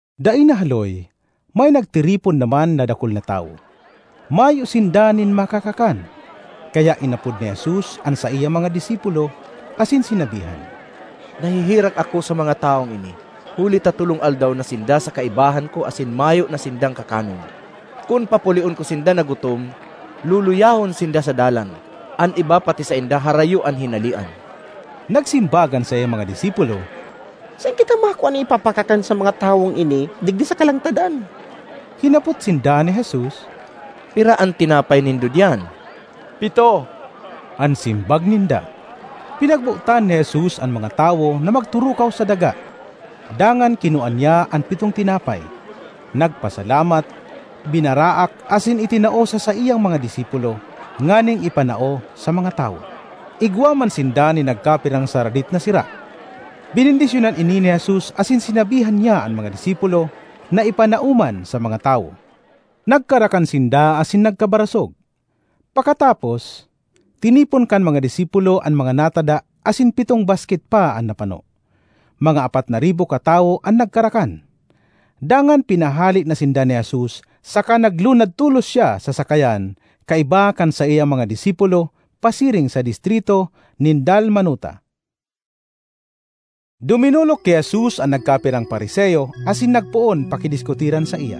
Dai nahaloy, may nagtiripon naman na dakul na tawo. Mayo sinda nin makakakan, kaya inapod ni Jesus an saiyang mga disipulo asin sinabihan, ”Naheherak ako sa mga tawong ini huli ta tolong aldaw na sinda sa kaibahan ko asin mayo na sindang kakanon. Kun papulion ko sinda na gutom, luluyahon sinda sa dalan; an iba pati sainda harayo an hinalean.” Nagsimbag an saiyang mga disipulo, “Saen kita makua nin ipapakakan sa mga tawong ini digdi sa kalangtadan?” Hinapot sinda ni Jesus, “Pira an tinapay nindo diyan?” “Pito,” an simbag ninda. Pinagbotan ni Jesus an mga tawo na magturukaw sa daga. Dangan kinua niya an pitong tinapay, nagpasalamat, binaraak asin itinao sa saiyang mga disipulo nganing ipanao sa mga tawo. Igwa man sinda nin nagkapirang saradit na sira; benendisyonan ini ni Jesus asin sinabihan niya an mga disipulo na ipanao man sa mga tawo. Nagkarakan sinda asin nagkabarasog. Pakatapos, tinipon kan mga disipulo an mga natada asin pitong basket pa an napano. Mga apat na ribo katawo an nagkarakan. Dangan pinahale na sinda ni Jesus saka naglunad tolos siya sa sakayan kaiba kan saiyang mga disipulo pasiring sa distrito nin Dalmanuta. Duminolok ki Jesus an nagkapirang Fariseo asin nagpoon pakidiskutiran saiya,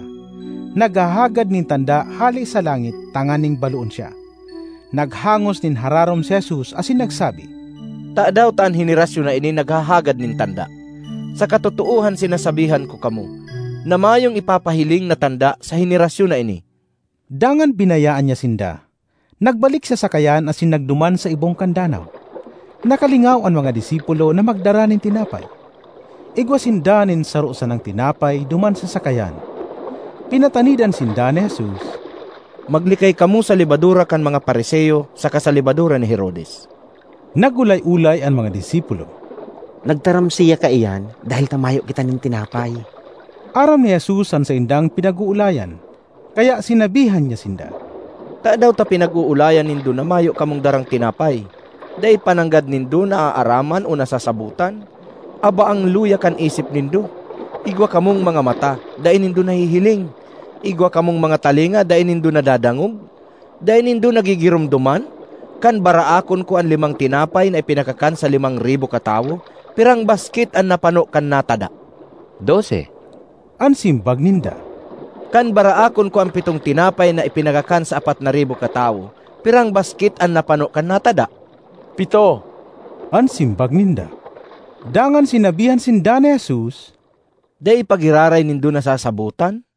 naghahagad nin tanda hale sa langit tanganing baloon siya. Naghangos nin hararom si Jesus asin nagsabi, “Tadaw ta an henerasyon na ini naghahagad nin tanda? Sa katotoohan sinasabihan ko kamo, na mayong ipapahiling na tanda sa henerasyon na ini!” Dangan binayaan niya sinda, nagbalik sa sakayan asin nagduman sa ibong kan danaw. Nakalingaw an mga disipulo na magdara nin tinapay. Igwa sinda nin saro sanang tinapay duman sa sakayan. Pinatanidan sinda ni Jesus, “Maglikay kamo sa lebadura kan mga Fariseo saka sa lebadura ni Herodes.” Nag-olay-olay an mga disipulo, “Nagtaram siya kaiyan dahel ta mayo kita nin tinapay.” Aram ni Jesus an saindang pinag-oolayan, kaya sinabihan niya sinda, “Tadaw ta pinag-oolayan nindo na mayo kamong darang tinapay? Dai pa nanggad nindo naaaraman o nasasabotan? Abaang luya kan isip nindo! Igwa kamong mga mata, dai nindo nahihiling? Igwa kamong mga talinga, dai nindo nadadangog? Dai nindo nagigiromdoman? Kan baraakon ko an limang tinapay na ipinakakan sa limang ribo katawo, pirang basket an napano kan natada?” “Dose,” an simbag ninda. ”Kan baraakon ko an pitong tinapay na ipinakakan sa apat na ribo katawo, pirang basket an napano kan natada?” “Pito,” an simbag ninda. Dangan sinabihan sinda ni Jesus, “Dai pa giraray nindo nasasabotan?”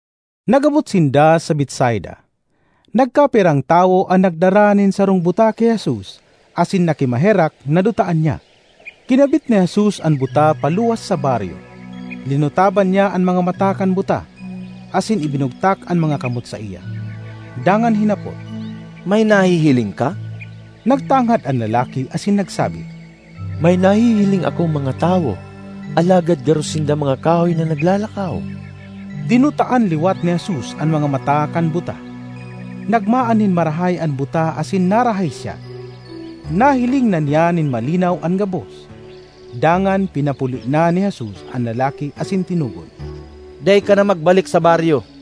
Nag-abot sinda sa Betsaida. Nagkapirang tawo an nagdara nin sarong buta ki Jesus asin nakimaherak na dutaan niya. Kinabit ni Jesus an buta paluwas sa baryo. Linutaban niya an mga mata kan buta, asin ibinugtak an mga kamot saiya, dangan hinapot, “May nahihiling ka?” Nagtangad an lalaki asin nagsabi, “May nahihiling akong mga tawo, alagad garo sinda mga kahoy na naglalakaw.” Dinutaan liwat ni Jesus an mga mata kan buta. Nagmaan nin marahay an buta asin narahay siya. Nahiling na niya nin malinaw an gabos. Dangan pinapuli na ni Jesus an lalaki asin tinugon, “Dai ka na magbalik sa baryo.”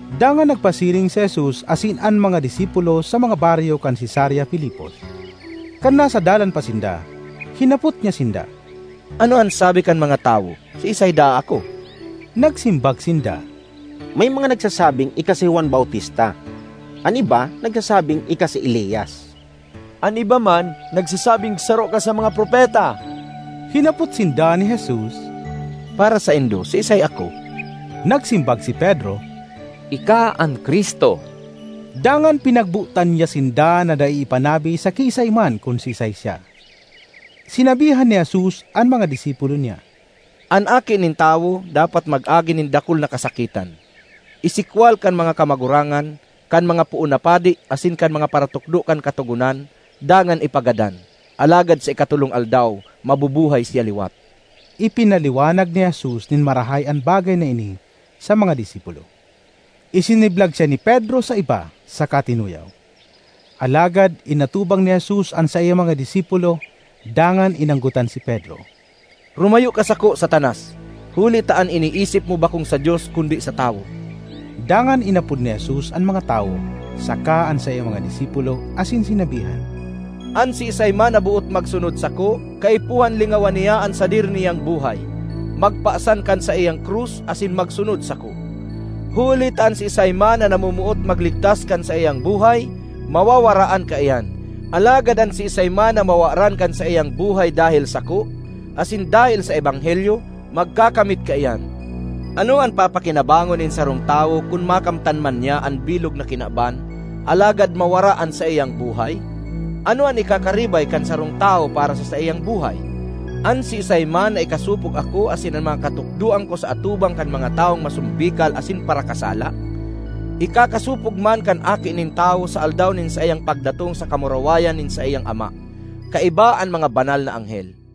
Dangan nagpasiring si Jesus asin an mga disipulo sa mga baryo kan Cesarea Filipos. Kan nasa dalan pa sinda, hinapot niya sinda, “Ano an sabi kan mga tawo, siisay daa ako?” Nagsimbag sinda, “May mga nagsasabing ika si Juan Bautista; an iba nagsasabing ika si Elias; an iba man nagsasabing saro ka sa mga propeta.” Hinapot sinda ni Jesus, “Para saindo, siisay ako?” Nagsimbag si Pedro, “Ika an Cristo.” Dangan pinagbotan niya sinda na dai ipanabi sa kiisay man kun siisay siya. Sinabihan ni Jesus an mga disipulo niya, “An Aki nin Tawo dapat mag-agi nin dakul na kasakitan, isikwal kan mga kamagurangan, kan mga poon na padi asin kan mga paratukdo kan Katogonan dangan ipagadan. Alagad sa ikatolong aldaw mabubuhay siya liwat.” Ipinaliwanag ni Jesus nin marahay an bagay na ini sa mga disipulo. Isiniblag siya ni Pedro sa iba saka tinuyaw. Alagad inatubang ni Jesus an saiyang mga disipulo dangan inanggotan si Pedro, “Rumayo ka sako, Satanas! Huli ta an iniisip mo bakong sa Dios, kundi sa tawo.” Dangan inapod ni Jesus an mga tawo saka an saiyang mga disipulo asin sinabihan, “An siisay man na boot magsunod sako, kaipuhan lingawan niya an sadiri niyang buhay, magpasan kan saiyang krus, asin magsunod sako. Huli ta an siisay man na namomoot magligtas kan saiyang buhay, mawawaraan kaiyan; alagad an siisay man na mawaran kan saiyang buhay dahel sako asin dahel sa ebanghelyo, magkakamit kaiyan. Ano an papakinabangon nin sarong tawo kun makamtan man niya an bilog na kinaban alagad mawara an saiyang buhay? Ano an ikakaribay kan sarong tawo para sa saiyang buhay? An siisay man na ikasopog ako asin an mga katukdoan ko sa atubang kan mga tawong masombikal asin parakasala, ikakasopog man kan Aki nin Tawo sa aldaw nin saiyang pagdatong sa kamurawayan nin saiyang Ama kaiba an mga banal na anghel.”